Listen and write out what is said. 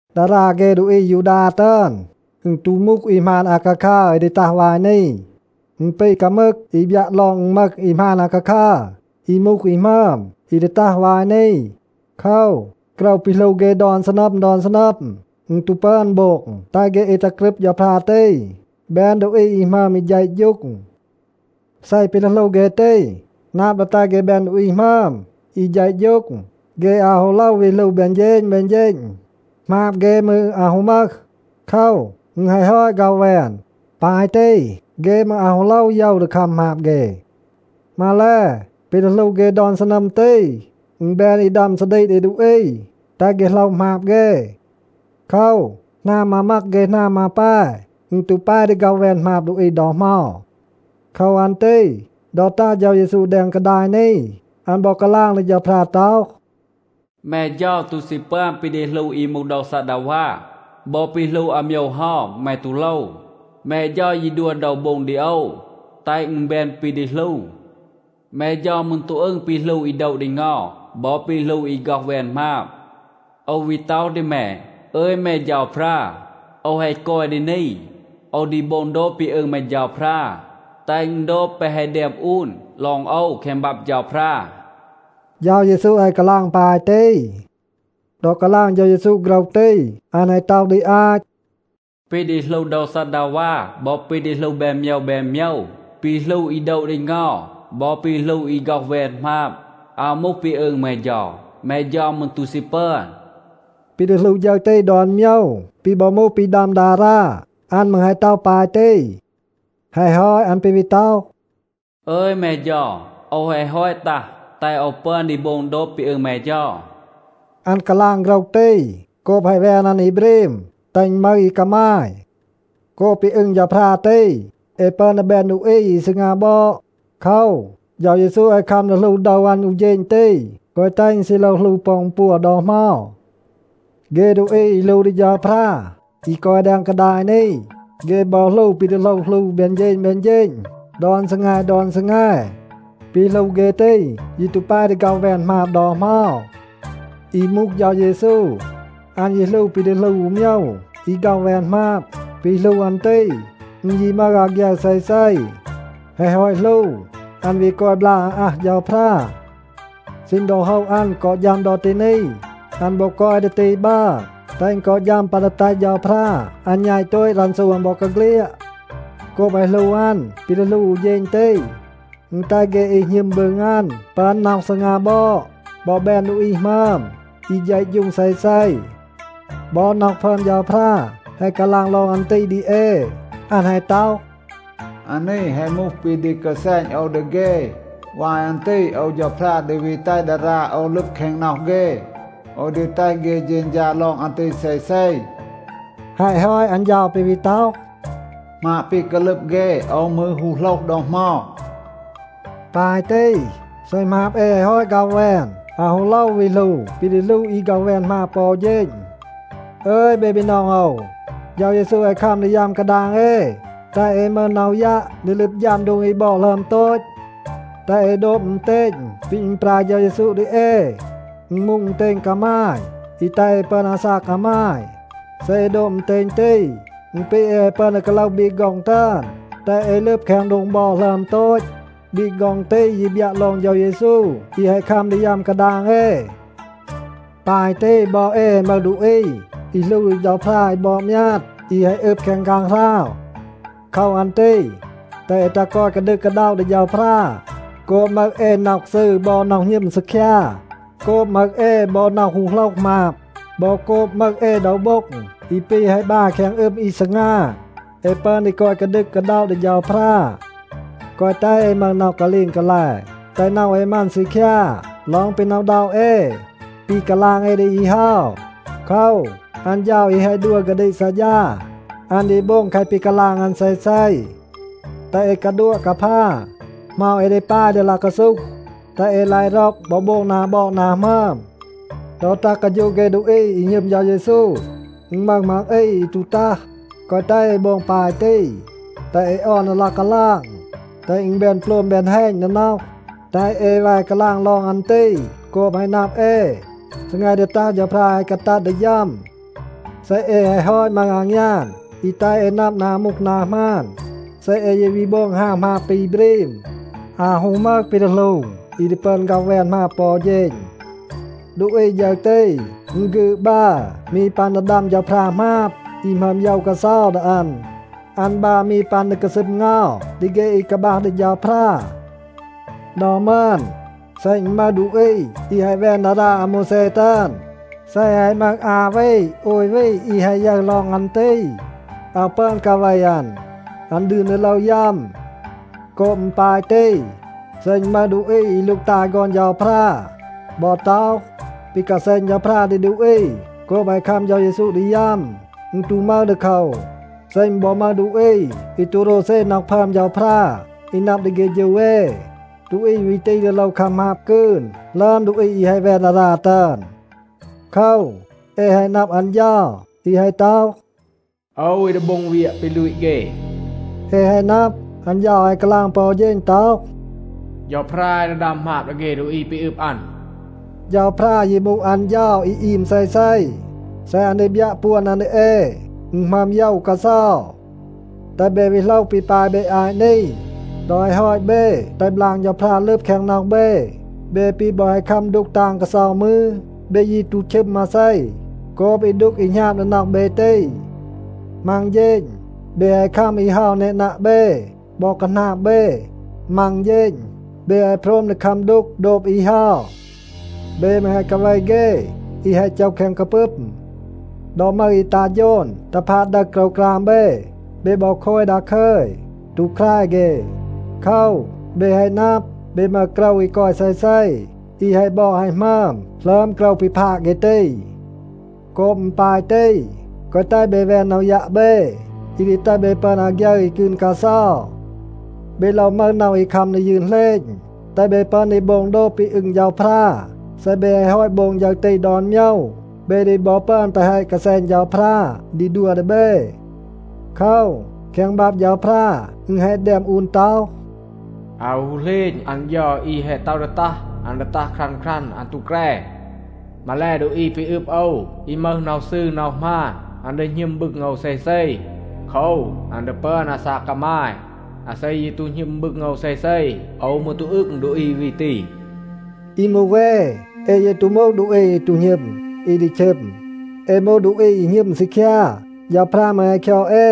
ดารา เฆ ดูอี อายูดา ตึอน, อึณ ตู มูห อี หมาน อาคาคัร อี ดี ตัห วาย นี. อึณ ปี กามึก อี บยัะ ลอง อึณ มึห อี หมาน อาคาคัร อี มูห อี หมึอม, อี ดี ตัห วาย นี. โคว, โกรว ปี หลู เฆ ดอน ซีนัม ดอน ซีนัม, อึณ ตู ปึอน โบง แตห เฆ อี ตัห กรึบ เฌาพรา ตี แบน ดูอี หมึอม อี เฌะฌูง. เซ ปี ดี หลู เฆ ตี นับ ดี แตห เฆ แบน ดูอี หมึอม อี เฌะฌูง, เฆ อาว ฮู โลว วี หลู แบน เฌณ แบน เฌณ. หมาบ เฆ มืร อาว ฮู มึห. โคว, อึณ แฮะ ฮอต ฆ็อห แวน. ปาย ตี, เฆ มืร อาว ฮู โลว โยว ดี คัม หมาบ เฆ. มาแล, ปี ดี หลู เฆ ดอน ซีนัม ตี, อึณ แบน อี ดัม ซาดีก ดี ดูอี, แตห เฆ โหลห หมาบ เฆ. โคว, หนาม มามัก เฆ หนาม มาแป, อึณ ตู แป ดี ฆ็อห แวน หมาบ ดูอี ดอ เหมา. โคว อัน ตี ดอ ตัห เฌา เยซู แดง กาดาย นี, อัน บอ กาลาง ดี เฌาพรา ต็อห, “แม เฌา ตู ซี ปึอน ปี ดี หลู อี มูห โดว ซัดดาวา. บอ ปี หลู อาโมยว เฮา แม ตู โลว. แม เฌา ยี ดัว โดว โบ็ง ดี โอว, แตห อึณ แบน ปี ดี หลู. แม เฌา มืร ตู อึง ปี หลู อี โดะ ดี เงา บอ ปี หลู อี ฆ็อห แวน หมาบ. โอว วี ต็อห ดี แม, ‘อึย แม เฌาพรา, โอว แฮะ กอย ดี นี, โอว ดี โบง โดบ ปี อึง แม เฌาพรา, แตห อึณ โดบ แปะ แฮะ แดม อูน ลอง โอว แคง บับ เฌาพรา.’” เฌา เยซู แฮะ กาลาง ปาย ตี. ดอ กาลาง เฌา เยซู โฆรห ตี, อัน แฮะ ต็อห ดี อาต, “ปี ดี หลู โดว ซัดดาวา บอ ปี ดี หลู แบน โมยว แบน โมยว, ปี หลู อี โดะ ดี เงา บอ ปี หลู อี ฆ็อห แวน หมาบ, อาว มูห ปี อึง แม เฌา. แม เฌา มืร ตู ซี ปึอน.” ปี ดี หลู ฌึร ตี ดอน โมยว ปี บอ มูห ปี ดัม ดารา, อัน มืร แฮะ ต็อห ปาย ตี. แฮะ ฮอต อัน ปี วี ต็อห, “อึย แม เฌา, โอว แฮะ ฮอต ตัห, แตห โอว ปึอน ดี โบง โดบ ปี อึง แม เฌา.” อัน กาลาง โฆรห ตี โกบ แฮะ แวน อัน อี บรีม, แตห อึณ มึห อี กามาย. โกบ ปี อึง เฌาพรา ตี, เอ ปึอน ดี แบน ดูอี อี ซีงา บอด. โคว, เฌา เยซู แฮะ คัม ดี หลู โดว อัน อู เฌณ ตี, แกวะ แตห อึณ ซี โลว หลู ปอ อึณ ปัว ดอ เหมา. เฆ ดูอี อี หลู ดี เฌาพรา อี กอย แดง กาดาย นี, เฆ บอ หลู ปี ดี โลว หลู แบน เฌณ แบน เฌณ, ดอน ซีแง ดอน ซีแง. ปี หลู เฆ ตี ยี ตู แป ดี ฆ็อห แวน หมาบ ดอ เหมา. อี มูห เฌา เยซู, อัน ยี หลู ปี ดี หลู อู โมยว อี ฆ็อห แวน หมาบ. ปี หลู อัน ตี, อึณ ยี มึห อาฆยึร เซเซ. แฮะ ฮอต หลู, อัน วี กอย บลาก อาอัห เฌาพรา. ซีณ ดอ โฮะ อัน กอ ฌัม ดอ ตี นี, อัน บอ กอย ดี ตี บัร, แตห อึณ กอ ฌัม ปัน ดี แตห เฌาพรา อัน แณต โตต รันซู อัน บอกาเฆลียด. โกบ แฮะ หลู อัน ปี ดี หลู อู เฌณ ตี, อึณ แตห เฆ อี หณึม บึง อัน ปึอน น็อห ซีงา บอด บอ แบน ดูอี หมึอม, อี เฌะฌูง เซเซ. บอ น็อห พึอม เฌาพรา แฮะ กาลาง ลอง อัน ตี ดี เอ. อัน แฮะ ต็อห, “อานี แฮะ มูห ปี ดี กาแซณ โอว ดี เฆ. วาย อัน ตี โอว เฌาพรา ดี วี แตห ดารา โอว ลึบ แคง น็อห เฆ. โอว ดี แตห เฆ เฌณฌา ลอง อัน ตี เซเซ.” แฮะ ฮอต อัน เฌา ปี วี ต็อห, “หมาบ แปะ แฮะ กาลึบ เฆ, โอว มืร ฮู โหลห ดอ เหมา.” ปาย ตี, เซ หมาบ เอ แฮะ ฮอต ฆ็อห แวน, อาว ฮู โลว วี หลู ปี ดี หลู อี ฆ็อห แวน หมาบ ปอ อู เฌณ. อึย เบ บีนอง โอว, เฌา เยซู แฮะ คัม ดี ยัม กาดาง เอ, แตห เอ มึห น็อห ยัะ ดี ลึบ ฌัม โดง อี บอด หลึอม โตต. แตห เอ โดบ อึณเตณ ปี อึณปราย เฌา เยซู ดี เอ. อึณ มูห อึณเตณ กามาย อี แตห เอ ปึอน อาซาก กามาย. เซ เอ โดบ อึณเตณ ตี, อึณ ปี เอ แฮะ ปึอน ดี กาโลห บีก ฆ็อง ตึอน, แตห เอ ลึบ แคง โดง บอด หลึอม โตต. บีก ฆ็อง ตี ยี บยัะ ลอง เฌา เยซู อี แฮะ คัม ดี ยัม กาดาง เอ. ปาย ตี บอ เอ แฮะ มึห ดูอี อี หลู ดี เฌาพรา อี บอด มยาด, อี แฮะ อึบ แคง ฆางหราว. โคว อัน ตี แตห เอ ตัห กอย กาดึก กาด็อะ ดี เฌาพรา. โกบ มึห เอ น็อห ซืร บอ น็อห หณึม ซีคยา, โกบ มึห เอ บอ น็อห ฮู โหลห หมาบ บอ โกบ มึห เอ โดว โบ็ง อี ปี แฮะ บาย แคง อึม อี ซีงา, เอ ปึอน ดี กอย กาดึก กาด็อะ ดี เฌาพรา. แกวะ แตห เอ มึห น็อห กาลีง กาแล, แตห น็อห เอ มัน ซีคยา ลอง ปี หน็อะ อึณด็อะ เอ ปี กาลาง เอ ดี อี เฮา. โคว, อัน เฌา อี แฮะ ดัว กาดีก ซัดฌา, อัน ดี โบง แคะ ปี กาลาง อัน เซเซ. แตห เอ กาดัวะ กาพา, เหมา เอ ดี ปาย ดี ลาย กาซูห, แตห เอ ลาย ร็อก บอ โบง นา บอด นา หมึอม. ดอ ตัห กาฌูะ เฆ ดูอี อี หณึม เฌา เยซู, อึณ มึห มัง อี อี ตู ตัห. แกวะ แตห เอ โบง ปาย ตี. แตห เอ ออน ดี ลาย กาลาง แตห อึณ แบน โปลม แบน แฮณ ดี น็อห. แตห เอ แว กาลาง ลอง อัน ตี โกบ แฮะ นับ เอ, ซีแง ดี ตัห เฌาพรา แฮะ กาตัด ดี ฌัม. เซ เอ แฮะ ฮอต มึห อางยาน อี แตห เอ นับ นา มูห นา หมาน, เซ เอ ยี วี โบง ฮาว หมาบ ปี บรีม, อาว ฮู มึห ปี ดี หลู อี ดี ปึอน ฆ็อห แวน หมาบ ปอ อู เฌณ. ดูอี ฌึร ตี, อึณ ฆีด บัร มี ปัน ดี ดัม เฌาพรา หมาบ อี หมึอม โยว กาเซา ดี อัน. อัน บัร มี ปัน ดี กาซึม เงา ดี เฆ อี กาบัห ดี เฌาพรา. ดอ มึอน, เซ อึณ มึห ดูอี อี แฮะ แวน ดารา อาโมวแซ ตึอน, เซ แฮะ มึห อา วี, โอย วี อี แฮะ ยึร ลอง อัน ตี, อาว ปึอน กาเว อัน. อัน ดืน ดี โลว ยัม. โกบ อึณ ปาย ตี, เซ อึณ มึห ดูอี อี ลูกตาย ฆอน เฌาพรา บอ ต็อห, ปี กาแซณ เฌาพรา ดี ดูอี โกบ แฮะ คัม เฌา เยซู ดี ยัม, อึณ ตู มึห ดีโคว, เซ อึณ บอ มึห ดูอี อี ตู โรวเซ น็อห พึอม เฌาพรา อี นับ ดี เฆฌู เอ, ดูอี วี ตี ดี โลว คัม หมาบ กืน หลึอม ดูอี อี แฮะ แวน ดารา ตึอน. โคว, เอ แฮะ นับ อัน เฌา อี แฮะ ต็อห, “โอว อี ดี โบง เวียะ ปี ลูต เฆ.” เอ แฮะ นับ, อัน เฌา แฮะ กาลาง ปอ อู เฌณ ต็อห, “เฌาพรา อี ดี ดัม หมาบ ดี เฆ ดูอี ปี อึบ อัน.” เฌาพรา ยี มูห อัน เฌา อี อีม เซเซ. เซ อัน ดี บยัะ ปวน อัน ดี เอ, อึณ หมึอม โยว กาเซา. แตห เบ วี โหลห ปี ปาย เบ อาต นี. ดอ แฮะ ฮอต เบ แตห บลาง เฌาพรา ลึบ แคง น็อห เบ, เบ ปี บอ แฮะ คัม ดูก ตาง กาเซา มืร, เบ ยี ตู ชึม มาเซ โกบ อี ดูก อี หณาบ ดี น็อห เบ ตี. มัง เฌณ เบ แฮะ คัม อี เฮา แนนัะ เบ บอ คาหนาบ เบ. มัง เฌณ เบ แฮะ โพรม ดี คัม ดูก โดบ อี เฮา. เบ มืร แฮะ กาเว เฆ อี แฮะ โจห แคง กาปึม. ดอ มึห อี ตัห โฌน ตัห พาด ดึห โกรวกราม เบ, เบ บอ โคย ดาคึย, ตู แคร เฆ. โคว, เบ แฮะ นับ, เบ มึห โกรว อี กอย เซเซ, อี แฮะ บอด แฮะ หมึอม หลึอม โกรว ปี พาด เฆ ตี. โกบ อึณ ปาย ตี, แกวะ แตห เบ แวน น็อห ยัะ เบ, อี ดี แตห เบ ปึอน อาฆยึร อี กืน กาเซา. เบ โลว มึห น็อห อี คัม ดี ยืน เหลณ, แตห เบ ปึอน ดี โบง โดบ ปี อึง เฌาพรา. เซ เบ แฮะ ฮอต โบง ฌึร ตี ดอน โมยว, เบ ดี บอ ปึอน แปะ แฮะ กาแซณ เฌาพรา ดี ดัว ดี เบ. โคว, แคง บับ เฌาพรา อึณ แฮะ แดม อูน ต็อห, “อาว ฮู เหลณ, อัน เฌา อี แฮะ ต็อห ดี ตัห, อัน ดี ตัห ครัน ครัน, อัน ตู แกร. มาแล, ดูอี ปี อึบ โอว, อี มึห น็อห ซืร น็อห หมาน, อัน ดี หณึม บึง โอว เซเซ. โคว, อัน ดี ปึอน อาซาก กามาย. อาเซ ยี ตู หณึม บึง โอว เซเซ, โอว มืร ตู อึง ดูอี วี ตี.” อี มูห เอ, เอ ยี ตู มูห ดูอี อี ตู หณึม, อี ดี ชึม. เอ มูห ดูอี อี หณึม ซีคยา. เฌาพรา มืร แฮะ คยอด เอ.